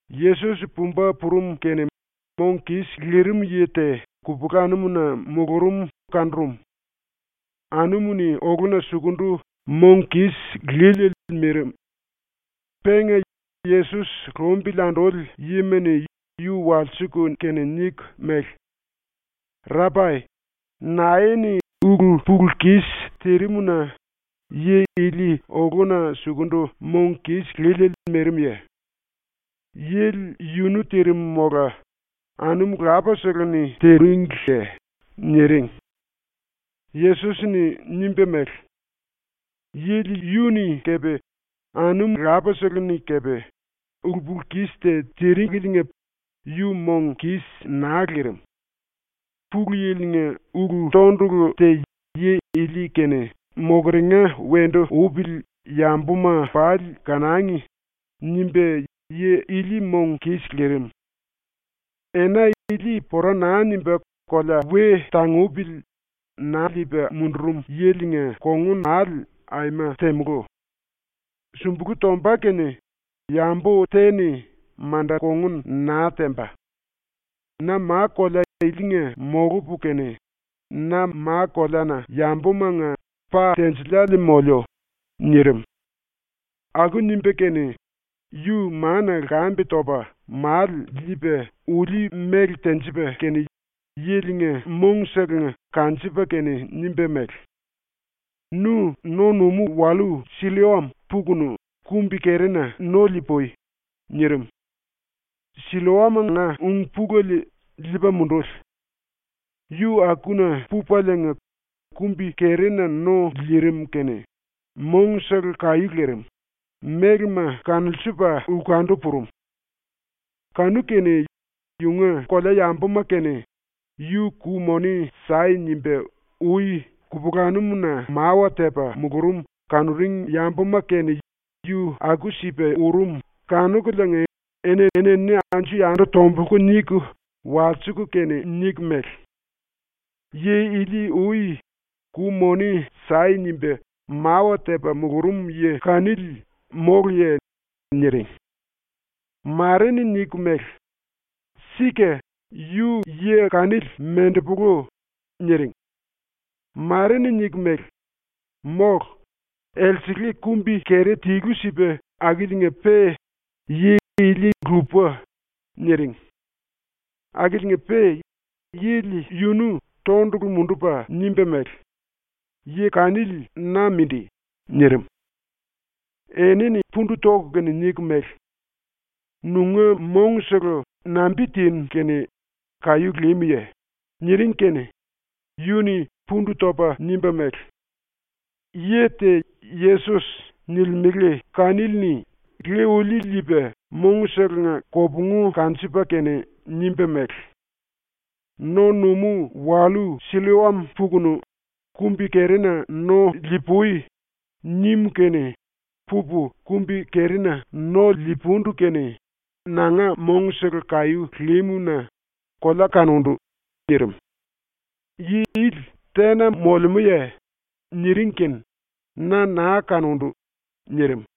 Yesos pumba purum kene mong kis lirim yi te kupulanum-na mulurum kanurum. Anumu-ni oluna sukundu mong kis líliele mirim. Penga Yesos lumbili anduli yima-ni yu walsiku kene niku mele: “Rapai, nae-ni ulu-pulu-kis tirim-na yi ili oluna sukundu mong kis líliele mirimye? Yili yunu tirim mola anum lapasele-ni tiringliye?” niring. Yesos-ni nimba mele: “Yili yu-ni kepe anum lapasele-ni kepe ulu-pulu-kis te tiringeliinga yu mong kis naa lirim. ‘Pulu Yili-nga ulu-tondulu te yi ili-kene mokeringa wendu upili yambuma pali kanangi.’ nimba yi ili mong kis lirim. Ena ili pora naa nimba kolea we tangupili na liipa mundurum yilinga kongun aima temulú. Sumbulu tomba kene yambu te-ni manda kongun naa temba. Na ma-kolea ilinga molupu kene, na ma-koleana yambumanga pa tinjiliele moliu.” nirim. Aku nimba kene yu mana lkambe topa male liipa ulí-mele tenjipa kene yilinga mongselenga kanjipa kene nimba mele: “Nu no-numú-wallú Silloam pukunu kumbi-kerina no li-pui.” nirim. (Silloam-nga ung-pulele ‘liipa munduli’.) Yu akuna pupaliinga kumbi-kerina no lirim kene mongsele kaí lirim, mélema kanulsiliipa lkundu purum. Kanu-kene yunga kolea yambuma kene “Yu ku-moni sai.” nimba ui kupulanum-na mawa tepa mulurum kanuring yambuma kene yu aku-sipa urum kanukuliinga eni-enini anju-yandu tombulku niku walsiku kene niku mele: “Yi ili ui “Ku-moni sai.” nimba mawa tepa mulurum yi kanili móluye?” niring. Mare-ni niku mele: “Sika, yu yi kanili mendepolu.” niring. Mare-ni niku mele: “Mólu. Elsele kumbi-keri tilu-sipa akiliinga-pe yi ili lupa.” niring. Akiliinga-pe yili yunu tondulu mundupa nimba mele: “Yi kanili na mindi.” nirim. Enini pundu toku kene niku mele: “Nunga mongsele nambi-tinu kene kaí límuye?” niring kene yu-ni pundu topa nimba mele: “Yi te ‘Yesos’ nilimele kanili-ni ulí liipa mongselenga kopungu kanjipa kene nimba mele: “No-numú-wallú Silloam pukunu kumbi-kerina no li-pui.” nim kene pupu kumbi-kerina no le-pundu kene nanga mongsele kaí límu-na kolea kanundu.” nirim. “Yi ili tena molemúye?” niring kene “Na naa kanundu.” nirim.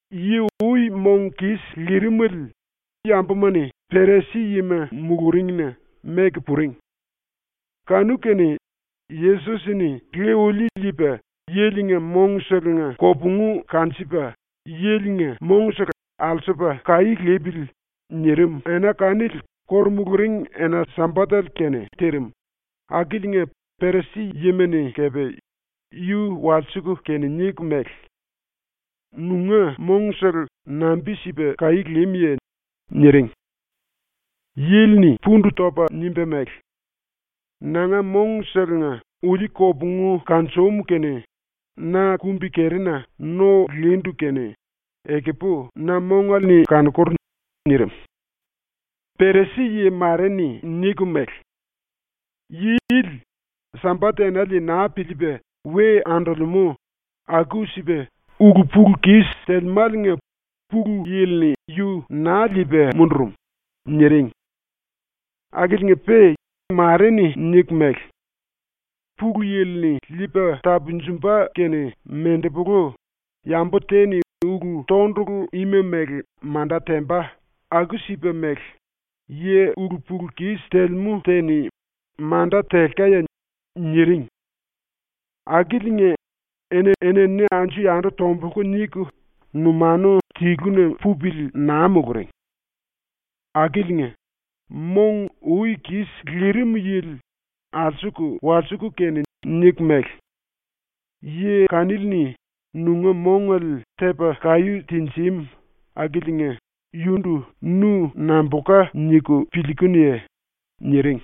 Yi ui mong kis lirimele yambuma-ni Perisi-yima muluringna meku puring. Kanu-kene, Yesos-ni le-ulí liipa yilinga mongselenga kopungu kanjipa yilinga mongsele ‘alsupa kaí lipili.’ nirim ena kanili ⸤kóru muluring⸥ ena-Sambatele kene tirim, Akiliinga Perisi-yima-ni kepe yu walsiku kene niku mele: “Nunga mongsele nambi-sipa kaí límuye?” niring. Yili-ni pundu topa nimba mele: “Nanga mongselenga ulí kopungu kanjum kene na kumbi-kerina no lindu kene ekupu na mongale-ni kanokur.” nirim. Perisi-yi mare-ni niku mele: “Yi ili Sambat-enale naa piliipa we andolemú, aku-sipa ulu-pulu-kis telemáliinga Pulu Yili-ni yu naa liipa mundurum.” niring. Akiliinga-pe mare-ni niku mele: “Pulu Yili-ni liipa tapunjumba kene mendepolu yambu te-ni ulu-tondulu ima mele manda temba aku-sipa mele yi ulu-pulu-kis telemú te-ni manda telkaye?” niring. Akiliinga, eni-enini anju-yandu tombulku niku numanu tiluna pupili naa muluring. Akiliinga, mong ui kis lirim yili alsuku walsiku kene niku mele: “Yi kanili-ni nunga mongale tepa kaí tinjim akiliinga yundu nu nambulka niku piliikunuye?” niring.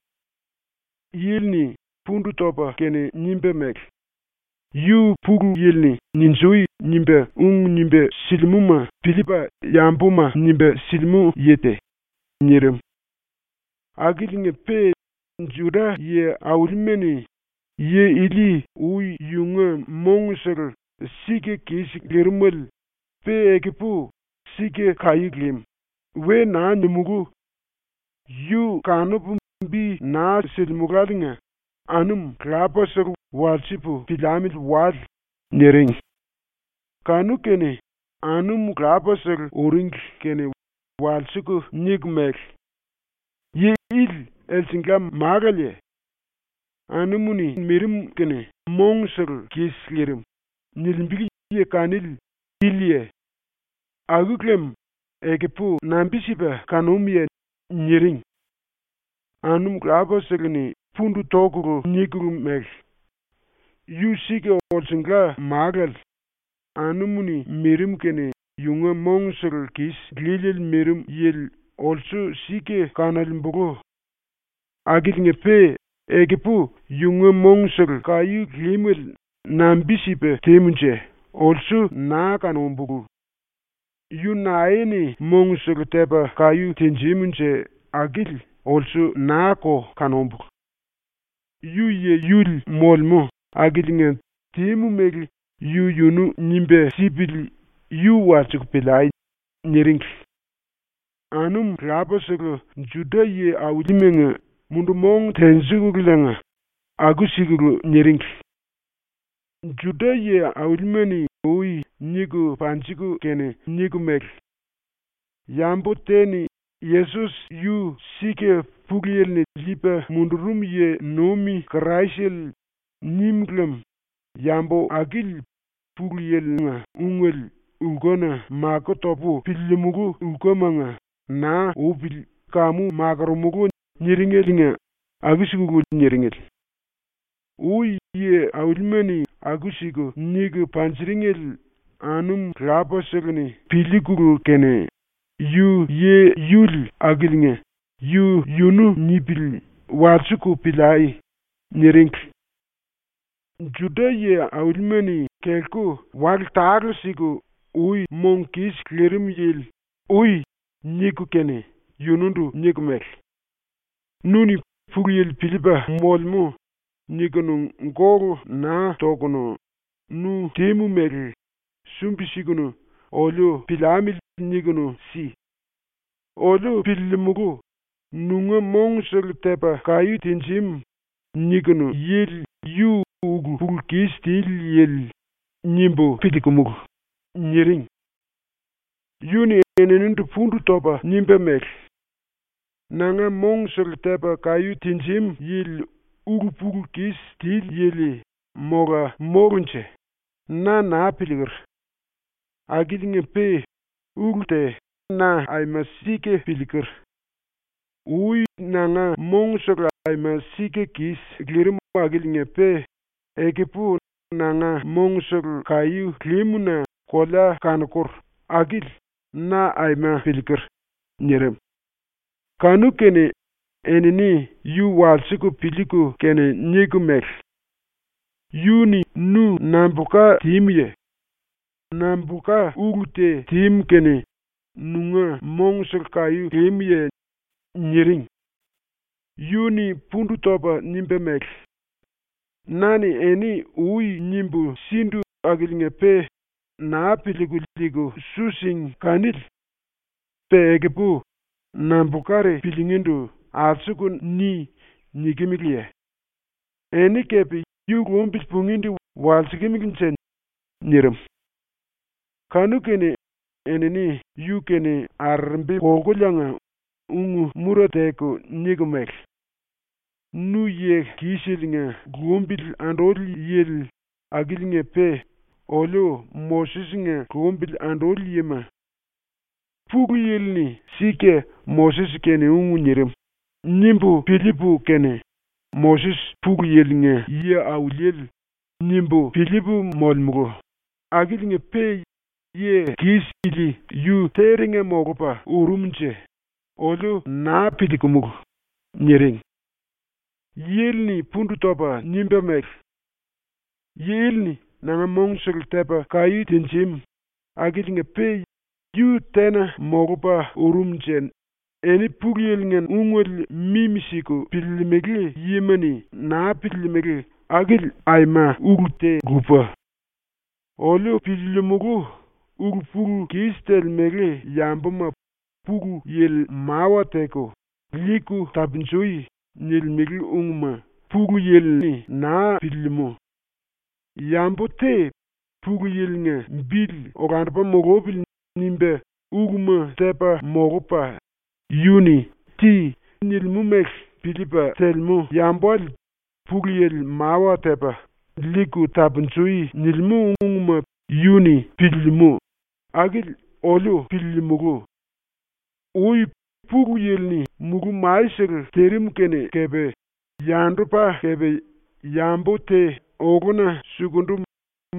Yili-ni pundu topa kene nimba mele: “Yu Pulu Yili-ni “Ninjui!” nimba ung nimba silimúma piliipa yambuma nimba silimú yi te.” nirim. Akiliinga-pe Juda yi-aulima-ni “‘Yi ili ui yunga mongsele sika kis lirimele, pe ekupu sika kaí lim.’ we naa nimulú. Yu kanupu bi naa silimuláliinga anum lapasele walsipu piliamili wale.” niring. Kanu-kene anum lapasele uringli kene walsiku niku mele: “Yi ili elsengla málaleye? “Anum-ni mirim kene mongsele kis lirim.” nilimbele yi kanili iliye? Aku lem ekupu nambi-sipa kanúmuye?” niring. Anum lapasele-ni pundu tokulu nikulu mele: “Yu sika olsunga málale, anumu-ni mirim kene yunga mongsele kis líliele mirim yili olsu sika kanolembulu. Akiliinga-pe ekupu yunga mongsele kaí límele nambi-sipa tímunje olsu naa kanúmbulu. Yu nae-ni mongsele tepa kaí tinjimunje akili olsu naa-ko kanúmbulu. Yu yi-yuli molemú akiliinga tímu mele yu-yunu nimba sipili yu walsiku piliai.” niringli. Anum lapasele Juda yi-aulimanga mundu-mong tenjikululiinga aku-sikulu niringli. Juda yi-aulima-ni ui niku panjiku kene niku mele: “Yambu te-ni ‘Yesos yu sika Pulu Yili-ni liipa mundurum yi-nuim Kraisele.’ nim lem yambu akili Pulu Yili-nga ungele lkuna máku topu piliilimulu lkumanga naa upili kamu makoromulú.” niringeliinga aku-sikulu niringli. Ui yi-aulima-ni aku-siku niku panjiringele anum lapasele-ni piliikulu kene “Yu yi-yuli akiliinga yu-yunu nipili walsiku piliai.” niringli. Juda yi-aulima-ni kelku wale tale-siku ui mong kis lirim yili “Ui.” niku kene yundu niku mele: “Nu-ni ‘Pulu Yili piliipa molemú.’ nikunu gólu naa tokunu, nu tímu mele sumbi-sikunu oliu piliamili nikunu si! Oliu piliilimulu, ‘ ‘Nunga mongsele tepa kaí tinjim.’ nikinu yili yu ulu-pulu-kis tili yili.’ nimbu piliikumulu.” niring. Yu-ni eninindu pundu topa nimba mele: “Nanga mongsele tepa kaí tinjim yili ulu-pulu-kis tili yili mola mólunje, na naa piliiker. Akiliinga-pe ulu te na aima sika piliiker. Ui nanga mongsele aima sika kis lirim akiliinga-pe ekupu nanga mongsele kaí límu-na kolea kanokur, akili na aima piliiker.” nirim. Kanu-kene enini yu walsiku piliiku kene niku mele: “Yu-ni nu nambulka tímuye? Nambulka ulu te tímu kene nunga mongsele kaí límuye?” niring. Yu-ni pundu topa nimba mele: “Na-ni eni ui nimbu sindu akiliinga-pe naa piliiku liiku su síngi kanili. Pe ekupu nambulkari piliingíndu alsuku “ni!” nikimeleye? Eni kepe yu lumbili pungíndu walsikimilinje?” nirim. Kanu-kene enini yu-kene arerembi kolkuliinga ung-mura teku niku mele: “Nu yi-kiseliinga lumbili anduli yili akiliinga-pe oliu Moses-nga lumbili anduli yima. ‘Pulu Yili-ni sika Moses-kene ung nirim.’ nimbu piliipu kene ⸤‘Moses Pulu Yili-nga yi-auliele.’ nimbu piliipu molemulu⸥ akiliinga-pe yi-kis ili yu terenga molupa urumunje, oliu naa piliikumulu.” niring. Yili-ni pundu topa nimba mele: “Yi ili-ni nanga mongsele tepa kaí tinjim akiliinga-pe yu tena molupa urumunje eni Pulu Yili-nga ungele mimi-siku piliilimili yima-ni naa piliilimili akili aima ulu te lupa. Oliu piliilimulu, ‘Ulu-pulu-kis telemele yambuma Pulu Yili mawa teku “Liiku tapunjui.” nilimele ungma Pulu Yili-ni naa piliilimú. Yambu te ‘Pulu Yili-nga bili olandupa mulupili.’ nimba uluma tepa molupa, yu-ni “Ti.” nilimú mele piliipa telemú yambale Pulu Yili mawa tepa “Liiku tapunjui.” nilimú ungma piliilimú.’ akili oliu piliilimulu. Ui Pulu Yili-ni mulú-masele tirim kene kepe yandupa kepe yambu te oluna sukundu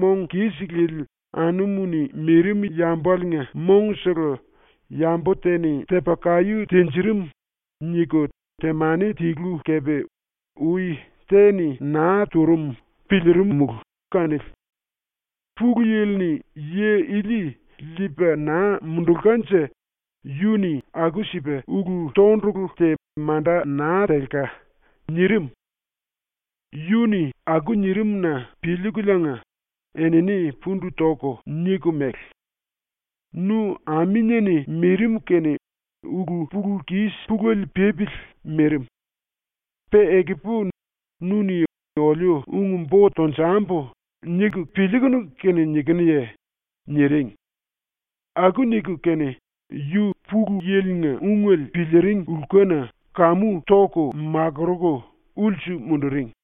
mong kis lili anumu-ni mirim yambaliinga mongsele yambu te-ni tepa kaí tinjirim niku temani tilu kepe ui te-ni naa turum piliirimulu kanili. Pulu Yili-ni yi ili liipa naa mundulkanje yu-ni aku-sipa ulu-tondulu te manda naa telka.” nirim. Yu-ni aku nirim-na piliikuliinga enini pundu toku niku mele: “Nu aminie-ni mirim kene ulu-pulu-kis pulele pípili mirim. Pe ekupu nu-ni ‘oliu ung-bo tonjambu.’ niku piliikunu kene nikinuye?” niring. Aku niku kene yu ⸤Pulu Yili-nga ungele piliiring lkuna kamu⸥ toku makuruku ulsu munduring.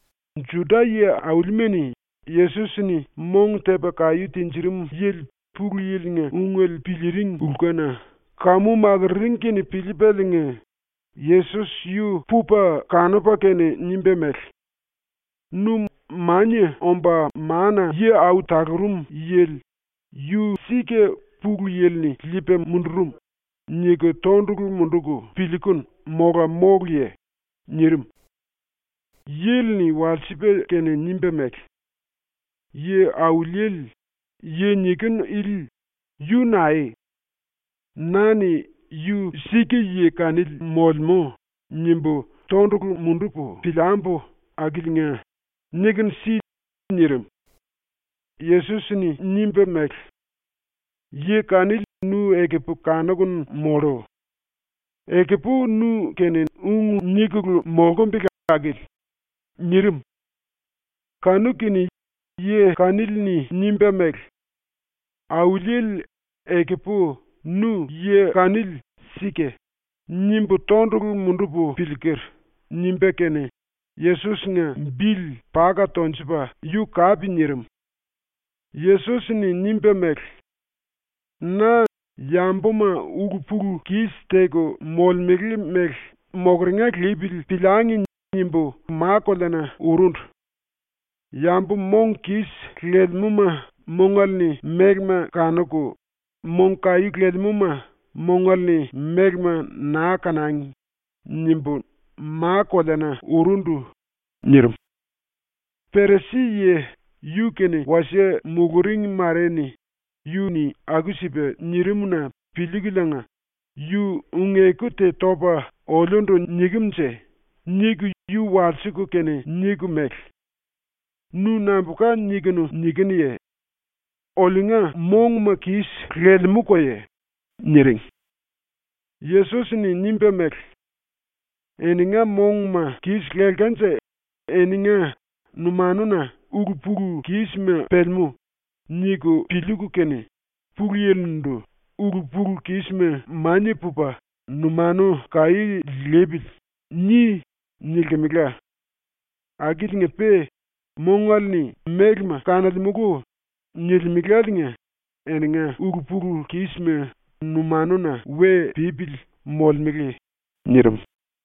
Juda yi-aulima-ni Yesos-ni mong tepa kaí tinjirim yili ⸤Pulu Yili-nga ungele piliiring lkuna⸥ kamu makururing kene piliipaliinga Yesos yu pupa kanupa kene nimba mele: “Nu Mania Omba Mana-Yi Au Talurum Yili ⸤‘Yu sika Pulu Yili-ni liipa mundurum⸥.’ niku tondulu munduku piliikunu mola móluye?” nirim. Yili-ni walsipa kene nimba mele: “Yi-Auliele, yi nikinu ili yu naeye? Na-ni ‘yu sika yi kanili molemú.’ nimbu tondulu mundupu piliambu akiliinga nikunu si.” nirim. Yesos-ni nimba mele: “Yi kanili nu ekupu kanukunu mollu. Ekupu nu-kene ung nikulu molkumbele akili.” nirim. Kanu-kene yi kanili-ni nimba mele: “Auliele, ekupu ‘Nu yi kanili sika.’ nimbu tondulu mundupu piliiker.” nimba kene Yesos-nga bili paka tonjupa yu kape nirim. Yesos-ni nimba mele: “Na ‘yambuma ulu-pulu-kis teku molemele mele mokeringa lipili piliangi.’ nimbu ma-koleana urundu. ‘Yambu mong kis lelemúma mongale-ni mélema kanuku, mong kaí lelemúma mongale-ni mélema naa kanangi.’ nimbu ma-koleana urundu.” nirim. Perisi-yi yu-kene wasie muluring mare-ni yu-ni aku-sipa nirim-na piliikuliinga ‘Yu ung-eku te topa oliundu nikem-nje?’ niku yu walsiku kene niku mele: “Nu nambulka nikunu nikinuye? Oliunga monguma kis lelemúkoye?” niring. Yesos-ni nimba mele: “Eninga monguma kis lelkanje eninga ‘numanuna ulu-pulu-kísima pelemú.’ niku piliiku kene, ⸤Pulu Yili-ndu⸥ “‘Ulu-pulu-kisma mania pupa numanu kaí lipili.’ ni.” nilkimela. Akiliinga-pe “Mongale-ni mélema kanolemulu.” nilimeláliinga eninga ulu-pulu-kísima numanuna we pípili molemele.” ⸤nirim.⸥